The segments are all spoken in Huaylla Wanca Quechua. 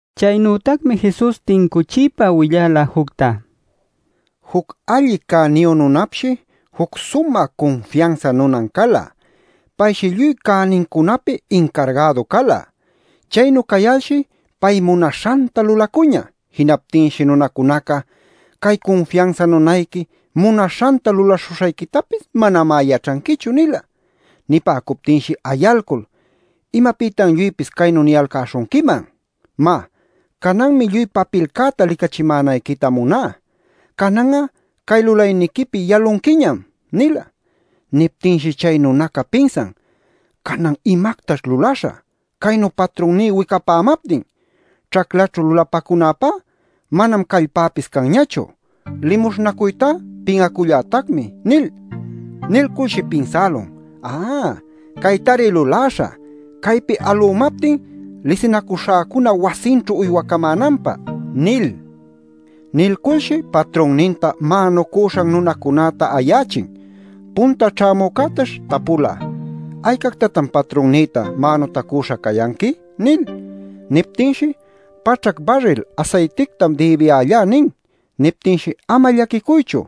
Chaynütacmi Jesus tincuchiypa willala jucta: “Juc alli cäniyu nunapshi juc sumä cunfiansa nunan cala. Payshi lluy cänincunapi incargädu cala. Chaynu cayalshi pay munaśhanta lulacuñä. Jinaptinshi nunacunaca: ‘Cay cunfiansa nunayqui munaśhanta lulaśhuśhayquitapis manamá yaćhanquichu’ nila. “Nipäcuptinshi ayalcul: ‘¿Imapïtan lluypis caynu niyalcäśhunquiman? Má, cananmi lluy papilcäta licachimänayquita muná. Canan'a cay lulayniquipi yalunquiñam’ nila. “Niptinshi chay nunaca pinsan: ‘¿Canan imactaćh lulaśhä caynu patrunní wicapämaptin? Ćhaclaćhu lulapacunäpá manam callpäpis canñachu; limuśhnacuytá pin'acullätacmi’ nil. Nilculshi pinsälun: ‘Ä, caytari luläśhä caypi alümaptin lisinacuśhäcuna wasinćhu uywaycamänanpä’ nil. “Nilculshi patrunninta mänucüśhan nunacunäta ayächin. Punta ćhämücätash tapula: ‘¿Aycactatan patrunnïta mänutacüśha cayanqui?’ nil. “Niptinshi: ‘Paćhac barril asaytictam dïbiyällá’ nin. Niptinshi: ‘Ama llaquicuychu.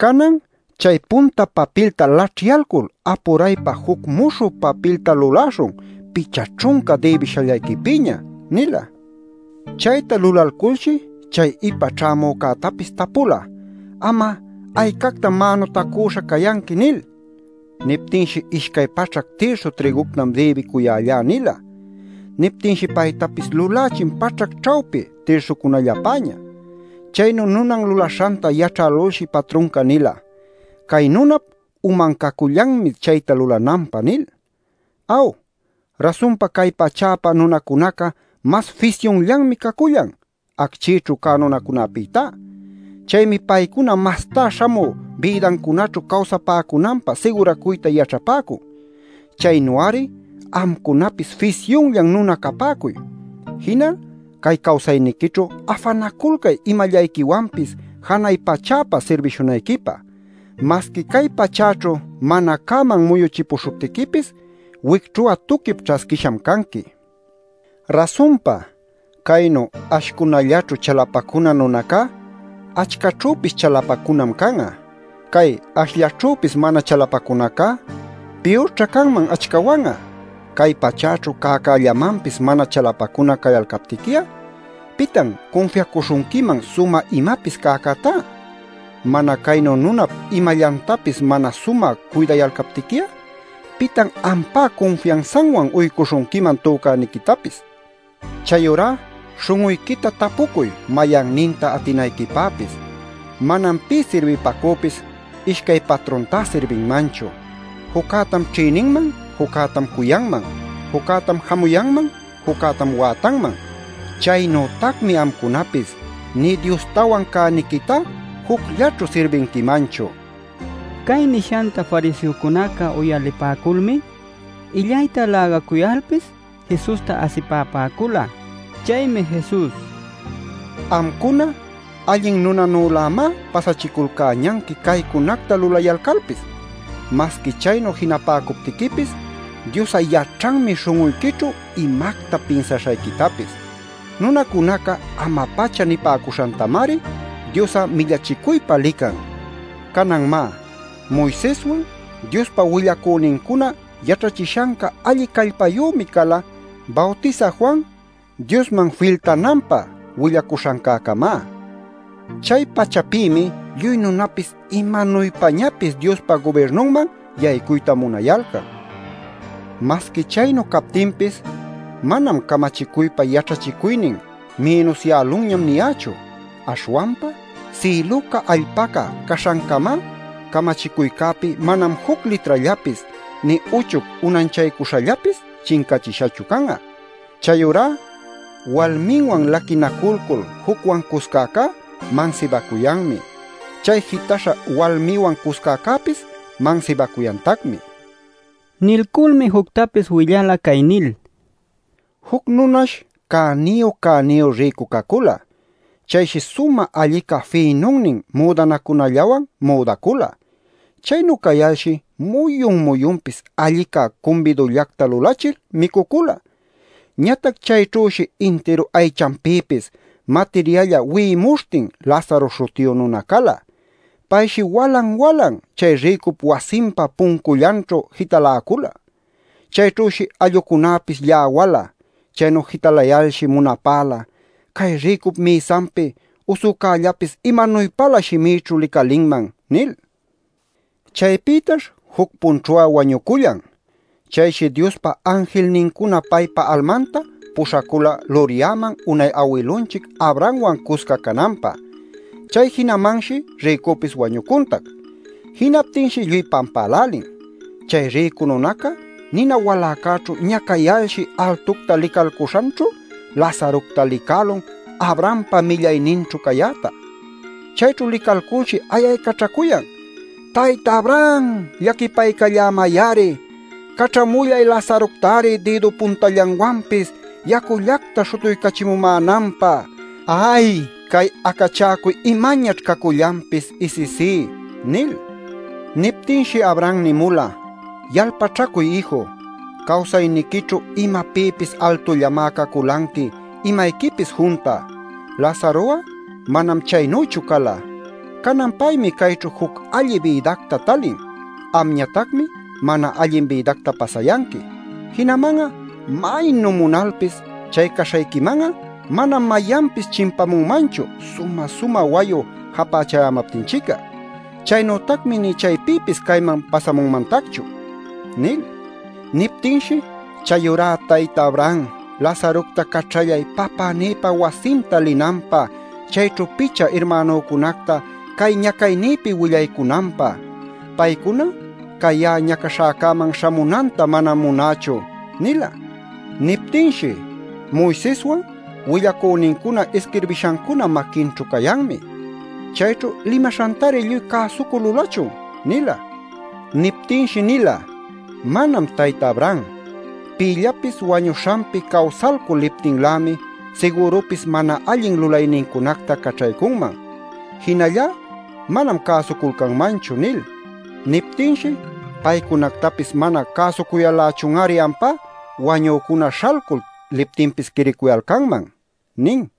Canan chay punta papilta laćhyalcul apuraypa juc muśhü papilta luläśhun picha ćhunca dïbishallayquipïña’ nila. “Chayta lulalculshi chay ipa ćhämücätapis tapula: ‘¿Am'a aycactam mänutacüśha cayanqui?’ nil. “Niptinshi: ‘Ishcay paćhac tirsu trïguctam dïbicuyällá’ nila. “Niptinshi paytapis lulächin paćhac ćhawpin tirsucunallapäña. “Chaynu nunan lulaśhanta yaćhälulshi patrunca nila: ‘Cay nunap uman cacullanmi chayta lulananpä’ nil. “Aw, rasunpa cay pachäpä nunacunaca mas fisyunllanmi cacullan acchïćhu cä nunacunapïtá. Chaymi paycuna mastá śhamü bïdancunaćhu cawsapäcunanpä siguracuyta yaćhapäcun. Chaynu-ari amcunapis fisyunllan nuna capäcuy. Jinal cay cawsayniquićhu afanaculcay imallayquiwanpis janay pachäpä sirbishunayquipä. Masqui cay pachäćhu mana cäman muyuchipuśhuptiquipis wicćhu'a tuquip ćhasquisham canqui. “Rasunpa, caynu ashcunallaćhu chalapacuna nunacá achcaćhüpis chalapacunam can'a. Cay ashllaćhüpis mana chalapacunacá piyurćha canman achcawan'a. Cay pachäćhu cäcällamanpis mana chalapacuna cayalcaptiqui'a ¿pitan cunfiacuśhunquiman sumä imapis cäcätá? Mana caynu nunap imallantapis mana sumä cuydayalcaptiqui'a ¿pitan ampá cunfiansanwan uycuśhunquiman tücäniquitapis? “Chayurá śhun'uyquita tapucuy mayanninta atinayquipäpis. Manam pï sirbipacüpis ishcay patruntá sirbinmanchu. Juccätam ćhïninman, juccätam cuyanman; juccätam jamuyanman, juccätam wätanman. Chaynütacmi amcunapis nï Diostawan cäniquitá jucllaćhu sirbinquimanchu” nila. Cay nishanta fariseocunaca uyalipäculmi illayta lägacuyalpis Jesusta asipapäcula. Chaymi Jesus: “Amcuna allin nunanülämá pasachiculcäñanqui caycunacta lulayalcalpis. Masqui chaynu jinapäcuptiquipis Dios'a yaćhanmi śhun'uyquićhu imacta pinsaśhayquitapis. Nunacunaca ama-pacha nipäcuśhantamari Dios'a millachicuypä lican. “Canan, má, Moiseswan, Diospa willacünincuna yaćhachishanca alli callpayümi cala Bawtisä Juan Diosman filtananpä willacuśhancäcamá. Chay pachapïmi lluy nunapis imanuypañapis Diospa gubirnunman yaycuyta munayalcan. [Masqui chaynu captinpis manam ‘Camachicuypa yaćhachicuynin mïnusyälunñam’ niyächu.] Aśhwanpa, sïluca allpaca caśhancamá, camachicuycäpi manam juc litrallapis, nï uchuc unanchaycuśhallapis chincachishachu can'a. “Chayurá walminwan laquinaculcul jucwan cuscäcá mansibacuyanmi. Chay jitaśha walmiwan cuscäcäpis mansibacuyantacmi” nila. Nilculmi juctapis willala cay nil: “Juc nunash cäniyu cäniyu rïcu cacula. Chayshi sumä allica fïnunnin müdanacunallawan müdacula. Chaynu cayalshi muyun-muyunpis allicá cumbidullacta lulachil micucula. Ñatac chayćhüshi intiru aychanpïpis matiryälla wi'imuśhtin Lazaro śhutiyu nuna cala. Payshi walan-walan chay rïcup wasinpa puncullanćhu jitaläcula. Chayćhüshi allucunäpis lläwala. Chaynu jitalayalshi munapäla: ‘Cay rïcup mïsanpi usücällapis imanuypalä shimïćhu licalinman’ nil. “Chaypïtash juc-punćhu'a wañucullan. Chayshi Diospa anjilnincuna paypa almanta puśhacula luryaman unay awilunchic Abrahamwan cusca cananpä. Chay jinamanshi rïcupis wañucuntac. Jinaptinshi lluy pampälälin. Chay rïcu nunaca nina waläcäćhu ñacayalshi altucta licalcuśhanćhu Lazarocta licälun Abrahampa millayninćhu cayäta. Chayćhu licalculshi ayaycaćhacuyan: ‘¡Tayta Abraham, llaquipaycallämay-ari! Caćhamullay Lazarocta-ari dïdu puntallanwanpis yacullacta śhutuycachimumänanpä. ¡Ay, cay acachäcuy imañaćh cacullanpis isisí!’ nil. “Niptinshi Abraham nimula: ‘Yalpaćhacuy ïju, cawsayniquićhu imapïpis altullamá caculanqui imayquipis junta. Lazaro'a manam chaynüchu cala. Canan paymi cayćhu juc allin bïdacta talin. Amñatacmi mana allin bïdacta pasayanqui. Jinaman'a maynu munalpis chay caśhayquiman'a manam mayanpis chimpamunmanchu, sumä-sumä wayu japächayämaptinchic'a. Chaynütacmi nï chaypïpis cayman pasamunmantacchu’ nil. “Niptinshi: ‘Chayurá tayta Abraham, Lazarocta caćhallay papänïpa wasinta linanpä chayćhu picha irmänücunacta cay ñacaynïpi willaycunanpä. Paycuna cay ya'a ñacaśhäcäman śhamunanta manam munächu’ nila. “Niptinshi: ‘Moiseswan willacünincuna isquirbishancuna maquinćhu cayanmi. Chayćhu limaśhantari lluy cäsucul lulachun’ nila. “Niptinshi nila: ‘Manam, tayta Abraham, pïllapis wañuśhanpi cawsalcul liptinlämi sigürupis mana allin lulaynincunacta caćhaycunman. Jinallá manam cäsuculcanmanchu’ nil. “Niptinshi: ‘¿Paycunactapis mana cäsucuyal-lächun-ari ampá wañücuna śhalcul liptinpis quiriycuyalcanman?’ nin” nila.